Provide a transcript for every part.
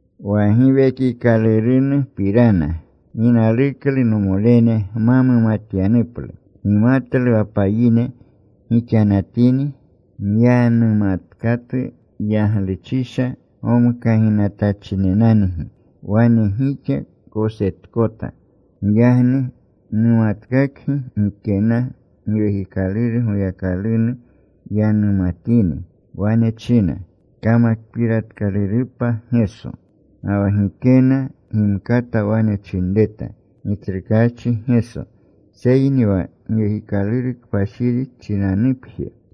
Wa Giwekikalurunupirana gi naluklu nomolene gma mumatyanuplu. Gimatlu wa payine gixanatini, myanumatkatu yagluchisha gomkaginatachinenangi wane gixa kosetkota. Giyagni numatkakgi gikena Giwekikaluru Goyakalunu yanumatini wane china, “Kamakpiratkalurupa Geso.” Ga wa gikena gimkata wane chinreta, “Gitsrukaachi Geso,” seyni wa Giwekikaluru Kpashiri chinanupje.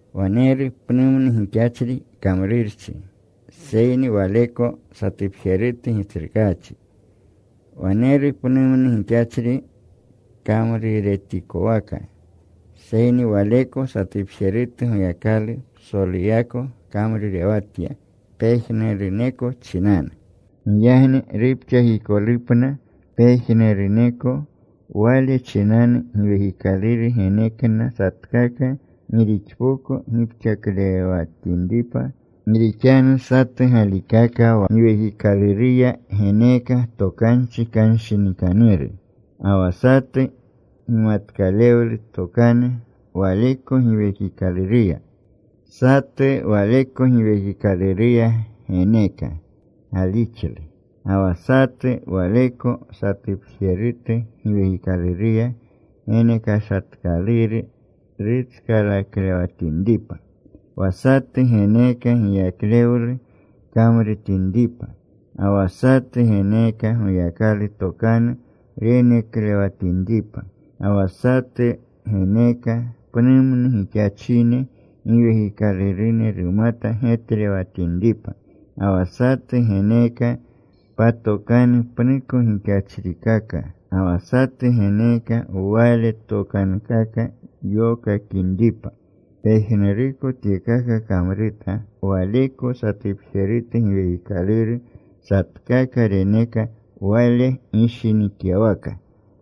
Waneru pnumnu gixachri kamrurchi, seyni Waleko satupjerutu Gitsrukaachi. Waneru pnumnu gixachri kamruretikowaka, seyni Waleko satupjerutu Goyakalu psoluyako kamrurewatya pejnuruneko chinanu. Giyagni rupxakikolupna pejnuruneko, wale chinanu Giwekikaluru genekna satkaka gi rixpoko gipxaklewatinripa Gi rixanu satu galikaka wa Giwekikaluruya geneeka tokanchi kanshinikanuru, ga wa satu gimatkalewlu tokanu Waleko Giwekikaluruya. Satu Waleko Giwekikaluruya geneeka galixlu. Ga wa satu Waleko satupjerutu Giwekikaluruya genekashatkaluru rutskalaklewatinripa. Wa satu geneeka giyaklewlu kamrutinripa. Ga wa satu geneeka Goyakalu tokanu reneklewatinripa. Ga wa satu geneeka pnumnu gixachine giwekiklurune rumata getlewatinripa. Ga wa satu geneeka patokanu pnuko gixachrikaka. Ga wa satu geneeka wale tokankaka yokakinripa. Pejnuruko tyekaka kamruta Waleko satupjerutu Giwekikaluru. Satkaka reneka Wale gishinikyawaka.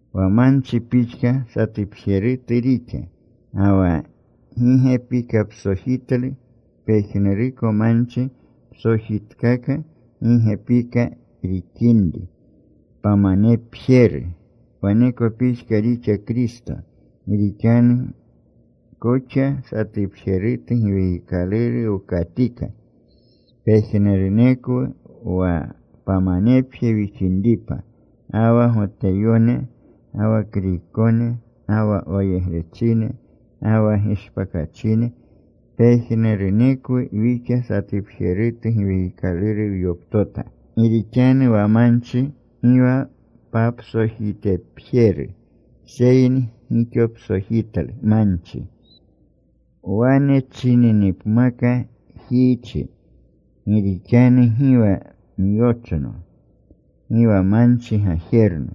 Wa manchi pixka satupjerutu rixa, ga wa gi gepikapsojitlu. Pejnuruko manchi psojitkaka, gi gepika rixinri, pamanepjeru. Waneko pixka rixa Kristo. Gi rixanu koxa satupjerutu Giwekikaluru wkatika pejnurunekwu wa pamanepje wixinripa, ga wa Goteyone, ga wa Kriykone, ga wa wayegrechine, ga wa gishpakachine. Pejnurunekwu wixa satupjerutu Giwekikaluru wyoptota. Gi rixanu wa manchi gi wa papsojitepjeru, seyni gixopsojitlu manchi. Wane chininipmaka jiichi, “Gi rixanu gi wa myochno, gi wa manchi gajerno,”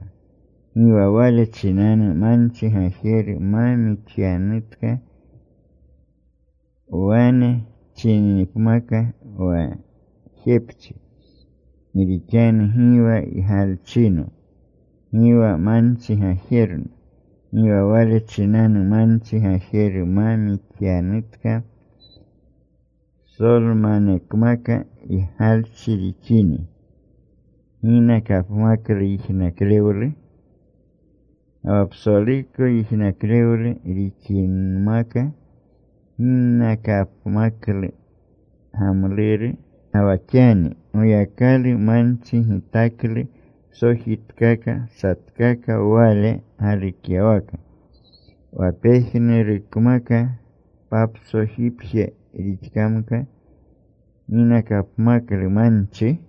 gi wa wale chinanu manchi gajeru ma mixyanutka. Wane chininipmaka wa jepchi, “Gi rixanu gi wa ygalchino, gi wa manchi gajerno,” gi wa wale chinanu manchi gajeru ma mixyanutka. Psolmanekmaka ygalchi rixini, ¿ginakapmaklu yijnaklewlu? Ga wa psoluko yijnaklewlu rixinmaka, ¿ginakapmaklu gamluru? Ga wa xani Goyakalu manchi gitaklu psojitkaka satkaka Wale galukyawaka. Wa pejnurukmaka papsojipje rixkamka, ¿ginakapmaklu manchi?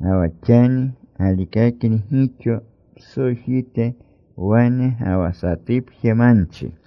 Ga wa xani galikakni gixo psojite wane, ga wa satupje manchi.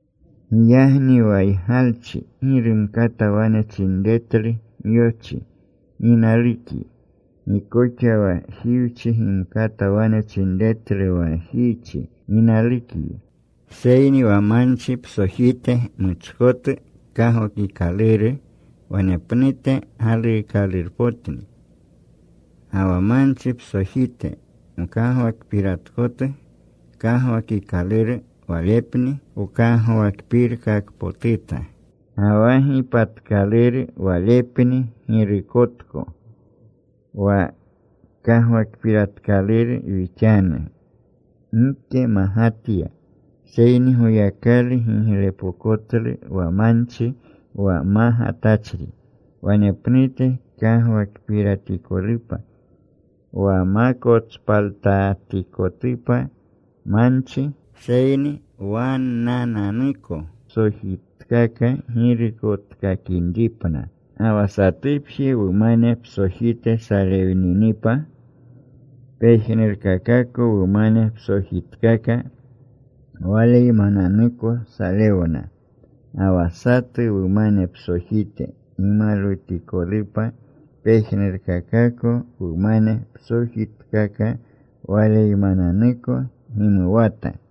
Giyagni wa ygalchi gi rumkata wane chinretlu myochi, “Gi nalukyi.” Gi koxa wa jiwchi gimkata wane chinretlu wa jiichi, “Gi nalukgi.” Seyni wa manchi psojite muchkotu kagwakikaluru wanepnute galuukalurpotni. Ga wa manchi psojite mkagwakpiratkotu kagwakikaluru walepni wkagwakpirkakpotuta. Ga wa gipatkaluru walepni girukotko. Wa kagwakpiratkaluru wixanu, gike magatya. Seyni Goyakalu giglepokotlu wa manchi, wa magatachri wanepnute kagwakpiratikolupa. Wa ma kotspaltatikotupa manchi, seyni wannananuko psojitkaka girukotkakinripna. Ga wa satupje wumane psojite salewninipa, pejnurkakako wumane psojitkaka waleymananuko salewna. Ga wa satu wumane psojite gimalwutikolupa, pejnurkakako wumane psojitkaka waleymananuko gimuwata.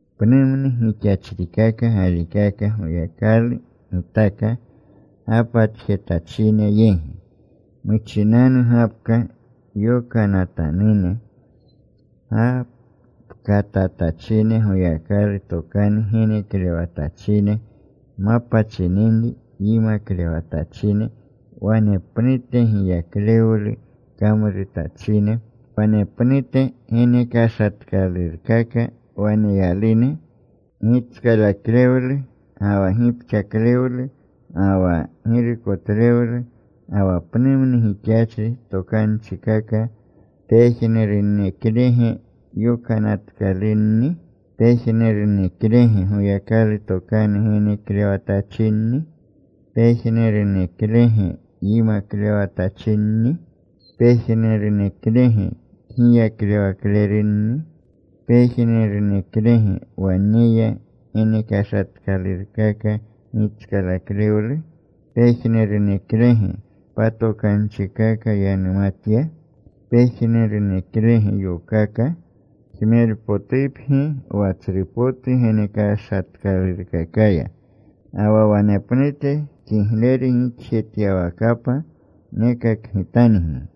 Pnumnu gixachrikaka galikaka Goyakalu gitaka gapatjetachine yegi: Muchinanu gapka yokanatanune. Gapkatatachine Goyakalu tokanu geneklewatachine. Mapa chininri yimaklewatachine. Wanepnute giyaklewlu kamrutachine Wanepnute genekashatkalurkaka waneyalune: gitskalaklewlu, ga wa gipxaklewlu, ga wa girukotlewlu, ga wa pnumnu gixachri tokanchikaka. ¿Pejnuruneklege yokanatkalunni? ¿Pejnuruneklege Goyakalu tokanu geneklewatachinni? ¿Pejnuruneklege yimaklewatachinni? ¿Pejnuruneklege kgiyaklewaklerunni? ¿Pejnuruneklege waneya genekashatkalurkaka gitskalaklewlu? ¿Pejnuruneklege patokanchikaka yanumatya? ¿Pejnuruneklege yokaka? Jmerpotupgi wa tsru potu genekashatkalurkakaya. Ga wa wanepnute kigleru gixjetyawakapa nekakgitangi.